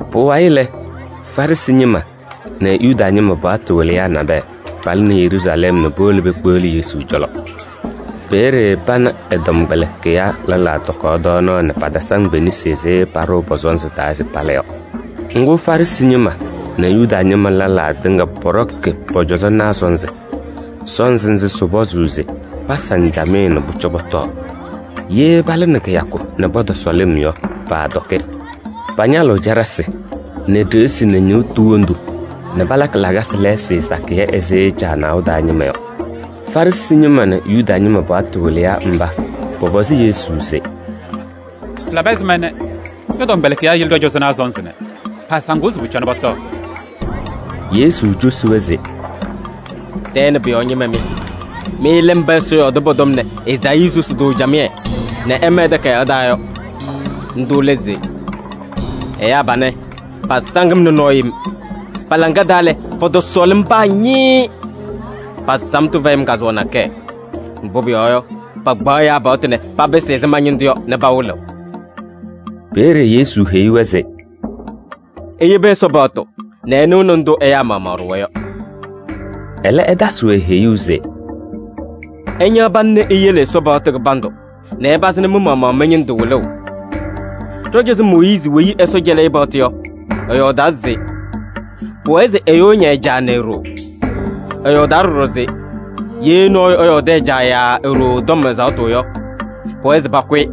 Pʋwayɩ lɛ, Farɩsɩ ñɩma nɛ Yuda ñɩma paɣtʋ wɩlɩyaa nabɛyɛ palɩnɩ Yeruusalɛm nɛ powolo pekpeɣli Yesu cɔlɔ. Peeye pana ɛ-tɔmkpɛlɩkɩyaa lɛlaa tɔkaɣ tɔɔnaɣ nɛ patasaŋ pe-nesi ɛzɩ paɖʋʋ pɔ-sɔnzɩ taa se pala yɔ. Ŋgʋ, Farɩsɩ ñɩma nɛ Yuda ñɩma lɛlaa tɩŋa pɔɖɔkɩ pɔ-cɔzɔnaa sɔnzɩ. Sɔnzɩ nzɩ sɩpɔzʋʋ se pasaŋ camɩyɛ nɛ pʋcɔ pɔtɔɔ. Ye palɩnɩ kɩyakʋ nɛ pɔtɔsɔ lɩm yɔ, paatɔkɩ. Pañalɩɣ caɖasɩ nɛ ɖeɣsi nɛ ñɩɣtʋ wondu nɛ palakɩ lakasɩ lɛɛsɩ sakɩyɛ ɛzɩ caanaʋ taa ñɩma yɔ. Farɩsɩ ñɩma nɛ Yuda ñɩma paɣtʋ wɩlɩyaa mba pɔpɔzɩ Yesu se: “Pɩlabɩ ɛzɩma ñɔ-tɔmkpɛlɩkɩyaa yele ɖɔ-cɔzɔnaa sɔnzɩ nɛ paasaŋɩɣ se pʋcɔ pɔtɔɔ?” Yesu cosi-wɛ se: “Tɛɛ nɛ pʋ-yɔɔ ñɩma mɩ! Mɩ lɛ mba Ɛsɔ yɔɔdɩ pɔ-tɔm nɛ Ezaayii susi-tʋ camɩyɛ nɛ ɛma ɛ-takayaɣ taa yɔ. Ndʋ lɛ se: ‘Ɛyaa panɛ pasaŋ-m nɛ nɔɔ yem. Pa-laŋa taa lɛ, pɔtɔsɔɔlɩ-m paa ñɩɩɩ. Pa-samtʋ fɛyɩ-m kazʋwa nakɛyɛ. Mbʋ pʋyɔɔ yɔ, pakpaɣ ɛyaa paɣtʋ nɛ papɩsɩ ɛzɩ ma-ñɩndʋ yɔ nɛ pawɩlɩɣ.’” Peeye Yesu heyi-wɛ se: “Iyebi Ɛsɔ paɣtʋ nɛ ɩnɩɣnɩ ndʋ ɛyaa maɣmaɣ ɖʋwa yɔ.” Ɛlɛ, ɛtasɩ-wɛ heyuu se: “Ɩñaɣ pana nɛ iyele Ɛsɔ paɣtʋ kɩbandʋ nɛ ɩpazɩnɩ mɩ-maɣmaɣ mɩ-ñɩndʋ wɩlʋʋ. Ɖɔ-cɔzɔ Mooyiizi weyi Ɛsɔ cɛlɩ-ɩ paɣtʋ yɔ, ɛyɔɔdaa se: ‘Pʋwɛɛ se ɛyʋ ɛña ɛ-caa nɛ e-ɖoo.’ Ɛyɔɔdaa ɖɔɖɔ se: ‘Ye nɔɔyʋ ɛyɔɔdɩ ɛ-caa yaa e-ɖoo tɔm ɛzaɣtʋ yɔ, pʋwɛɛ se pakʋ-ɩ.’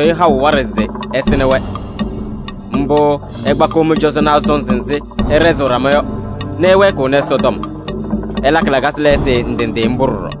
ɩɩtasɩɣ-ɩ haʋ waɖɛ se ɛsɩnɩ-wɛ. Mbʋ ɩkpakɩɣ mɩ-cɔzɔnaa sɔnzɩ nzɩ ɩɖɛzɩɣ ɖama yɔ nɛ ɩwɛɛkɩɣnɩ Ɛsɔtɔm. Ɩlakɩ lakasɩ lɛɛsɩ ndɩ ndɩ mbʋ ɖɔɖɔ.”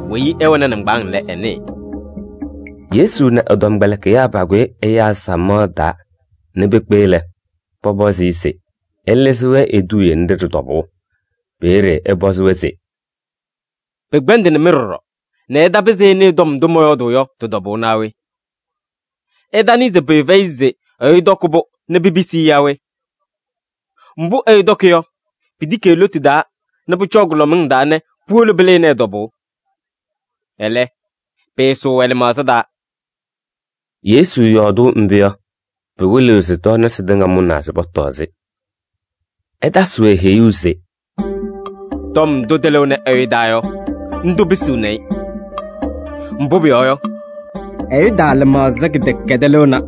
Weyi ɛwɛnɩ nɩŋgbaaŋ lɛ, ɛnɩɩ.]” Yesu nɛ ɛ-tɔmkpɛlɩkɩyaa pakʋyɩ ɛyaa samaɣ taa nɛ pekpe lɛ, pɔpɔzɩ-ɩ se ɛlɩzɩ-wɛ eduuye nɖɩ ɖɩ-tɔbʋʋ. Peeye ɛpɔzɩ-wɛ se: “Pɩkpɛndɩnɩ-mɩ ɖɔɖɔ nɛ ɩtapɩzɩ ɩnɩɩ tɔm ndʋ mɔyɔɔdʋʋ yɔ tɩ-tɔbʋʋ naa we? Ɩtanɩɩ se pʋyʋ fɛyɩ se ɛyʋ tɔkɩ-pʋ nɛ pipisi-i yaa we? Mbʋ ɛyʋ tɔkɩ yɔ, pitiki e-lotu taa nɛ pʋcɔɔ kʋlɔmɩŋ taa nɛ puwolo pɩlɩnɩ ɛ-tɔbʋʋ. Ɛlɛ, pɩɩsʋʋ ɛ-lɩmaɣza taa.” Yesu yɔɔdʋʋ mbʋ yɔ, pɩwɩlɩɣ se tɔɔnasɩ tɩŋa mʋnaa se pɔtɔɔ-sɩ. Ɛtasɩ-wɛ heyuu se: “Tɔm ndʋ tɩlɩɣnɩ ɛyʋ taa yɔ, ndʋ pisiɣni-i.” Mbʋ pʋyɔɔ yɔ, ɛyʋ taa lɩmaɣza kɩdɛkɛdɛɛ lɩɣna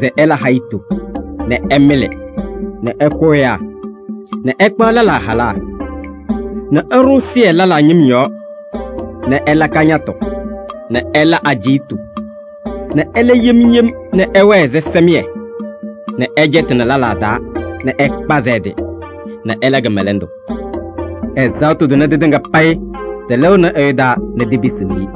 se ɛla hayitu nɛ ɛmɩlɩ nɛ ɛkʋ ɛyaa nɛ ɛkpaɣ lɛlaa halaa nɛ ɛɖʋ ɛzɩyɛ lɛlaa ñɩm yɔɔ nɛ ɛla kañatʋ nɛ ɛla ajiitu nɛ ɛla yem yem nɛ ɛwɛɛ ɛzɩsɛmɩyɛ nɛ ɛcɛtɩnɩ lɛlaa taa nɛ ɛkpazɩ ɛ-tɩ nɛ ɛla kɩmɛlɛndʋ. Ɛzaɣtʋ tʋnɛ tɩtɩŋa payɩ tɩlɩɣnɩnɩ ɛyʋ taa nɛ tipisiɣ-i.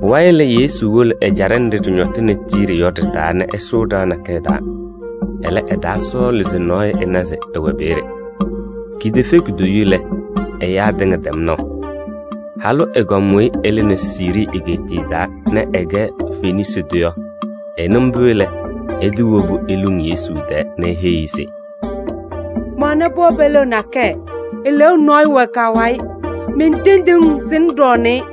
Pʋwayɩ lɛ, Yesu wolo ɛjaɖɛ nɖɩ ɖɩñɔtɩnɩ Tiiri yɔ ɖɩ-taa nɛ ɛsʋʋ ɖɩɣa nakɛyɛ taa. Ɛlɛ, ɛtaasɔɔlɩ se nɔɔyʋ ɛna se ɛwɛ peeye. Kitefe kutoyu lɛ, ɛyaa tɩŋa tɛm naʋ. Halʋ ɛgɔm weyi ɛlɩnɩ Siirii egeetiye taa nɛ ɛkɛ Fenisii tʋ yɔ, ɛnɩ mbʋ lɛ, ɛtɩwobu eluŋ Yesu tɛɛ nɛ eheyi-i se: “Mɛwɛnɩ pɩɣa peliɣa nakɛyɛ, eleeu nɔyʋ wɛ ka-wayɩ. Mentendiɣ-ŋ se ŋɖɔɔnɩ-ɩ.”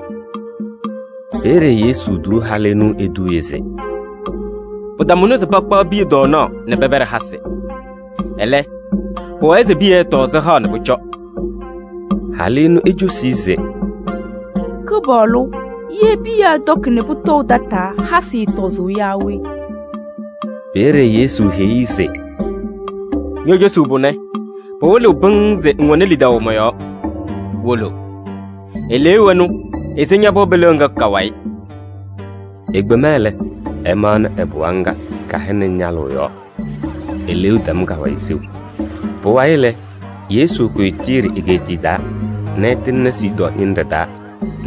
Peeye Yesu tuu halʋ ɛnʋ eduuye se: “Pɩtamʋnɩ se pakpaɣ piya tɔɔnaɣ nɛ pɛpɛɖɩ hasɩ. Ɛlɛ, pʋwɛɛ se piya ɛtɔɔ sɩhaɣ nɛ pʋcɔ.” Halʋ ɛnʋ ecosi-i se: “Kɩpaɣlʋ! Ye piya ɛtɔkɩ nɛ pʋtɔʋ tataa, hasɩ ɛɛtɔzʋʋ yaa we?” Peeye Yesu heyi-i se: “Ño-cosuu pʋnɛ pɩwɩlɩɣ pɩŋŋ se ŋwɛnɩ lidaʋ mɔ-yɔɔ: wolo. Eleeu ɛnʋ ese ña-pɩɣa peliɣa ŋga ka-wayɩ.” Ekpema lɛ, ɛmaɣnɩ ɛ-pɩɣa ŋga kɛhɛnɩ ñalʋʋ yɔɔ. Eleeu tɛm ka-wayɩ seu. Pʋwayɩ lɛ, Yesu kʋyɩ Tiiri egeetiye taa nɛ ɛtɩŋnɩ Sidɔɔ ñɩnɖɛ taa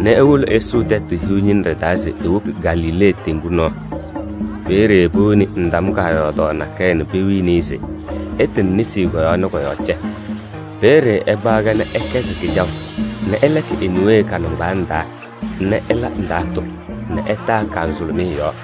nɛ ewoko ɛsʋʋ Tɛtʋ Hiu ñɩnɖɛ taa se ewoki Galilee teŋgu nɔɔ. Peeye powoni ndam kaayɔɔdaɣ nakɛyɛ nɛ pewini-i se ɛtɩnɩ nesi kɔ-yɔɔ nɛ kɔ-yɔɔ cɛ. Peeye ɛkpaɣ-kɛ nɛ ɛkɛzɩ kɩjaʋ nɛ ɛlɛkɩ e-niwee ka-nɩŋgbaaŋ taa nɛ ɛla ndaatʋ nɛ ɛtaa ka-nzʋlʋmɩyɛ yɔɔ.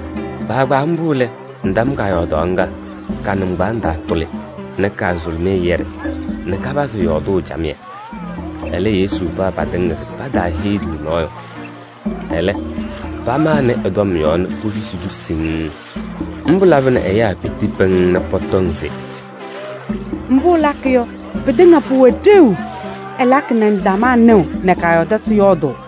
Kpaagbaa mbʋ lɛ, ndam kaayɔɔdaɣ ŋga, ka-nɩŋgbaaŋ taa tʋlɩ nɛ ka-nzʋlʋmɩyɛ yɛɖɩ nɛ kapazɩ yɔɔdʋʋ camɩyɛ. Ɛlɛ, Yesu paɣ patɩŋa se pataaheyi-tʋ nɔɔyʋ, ɛlɛ pamanɩ ɛ-tɔm yɔɔ nɛ posusi-tʋ siŋŋ. Mbʋ labɩnɩ ɛyaa piti pɩŋŋ nɛ pɔtɔŋ se: “Mbʋ ɛlakɩ yɔ, pɩtɩŋa pʋwɛ ɖeu. Ɛlakɩ nɛ ndamaa nɩɣ nɛ kaayɔɔdasɩ yɔɔdʋʋ.”